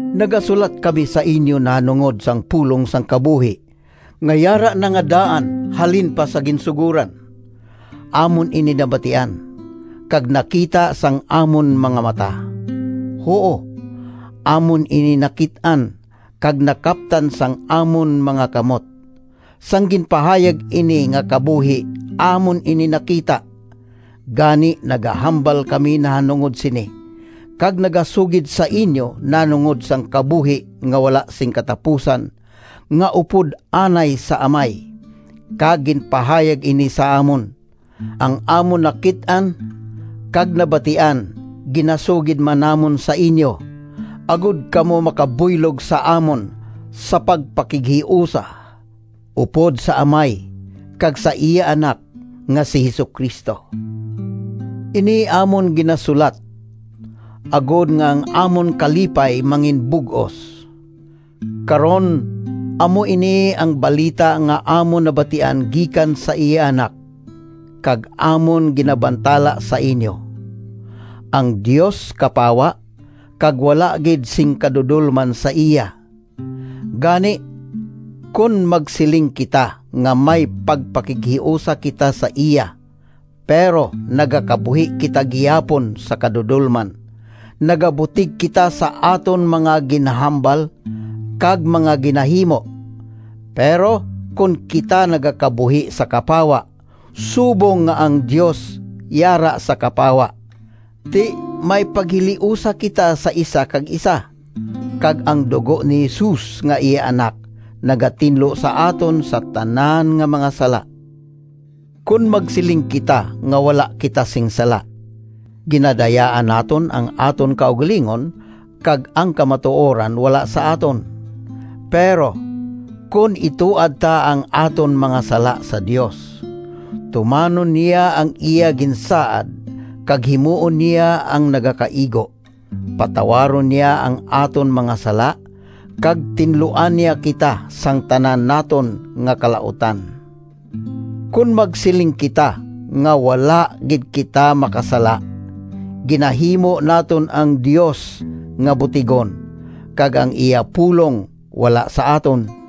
Nagasulat kami sa inyo nahanungod sang Pulong sang kabuhi nga yara na nga daan halin pa sa ginsugoran. Amon ini nabatian, kag nakita sang amon mga mata. Huo, amon ini nakit-an, kag nakaptan sang amon mga kamot. Sang ginpahayag ini nga kabuhi, amon ini nakita. Gani nagahambal kami nahanungod sini kag nagasugid sa inyo nahanungod sang kabuhi nga wala sing katapusan nga upod anay sa Amay, kag ginpahayag ini sa amon. Ang amon nakit-an kag nabatian ginasugid man namon sa inyo, agod kamo makabuylog sa amon sa pagpakighiusa upod sa Amay kag sa iya Anak nga si Jesu-Cristo. Ini amon ginasulat, agod nga ang amon kalipay manginbug-os. Karon amo ini ang balita nga amon nabatian gikan sa iya Anak kag amon ginabantala sa inyo: ang Dios kapawa kag wala gid sing kadudolman sa iya. Gani, kon magsiling kita nga may pagpakighiusa kita sa iya, pero nagakabuhi kita gihapon sa kadudolman, nagabutig kita sa aton mga ginahambal kag mga ginahimo. Pero kon kita nagakabuhi sa kapawa, subong nga ang Dios yara sa kapawa, ti may paghiliusa kita sa isa kag isa, kag ang dugo ni Jesus nga iya Anak nagatinlo sa aton sa tanan nga mga sala. Kon magsiling kita nga wala kita sing sala, ginadayaan naton ang aton kaugalingon kag ang kamatuoran wala sa aton. Pero, kon ituad ta ang aton mga sala sa Dios, tumanon niya ang iya ginsaad kag himuon niya ang nagakaigo: patawaron niya ang aton mga sala, kag tinluan niya kita sang tanan naton nga kalautan. Kon magsiling kita nga wala gid kita makasala, ginahimo naton ang Dios nga butigon, kag ang iya pulong wala sa aton.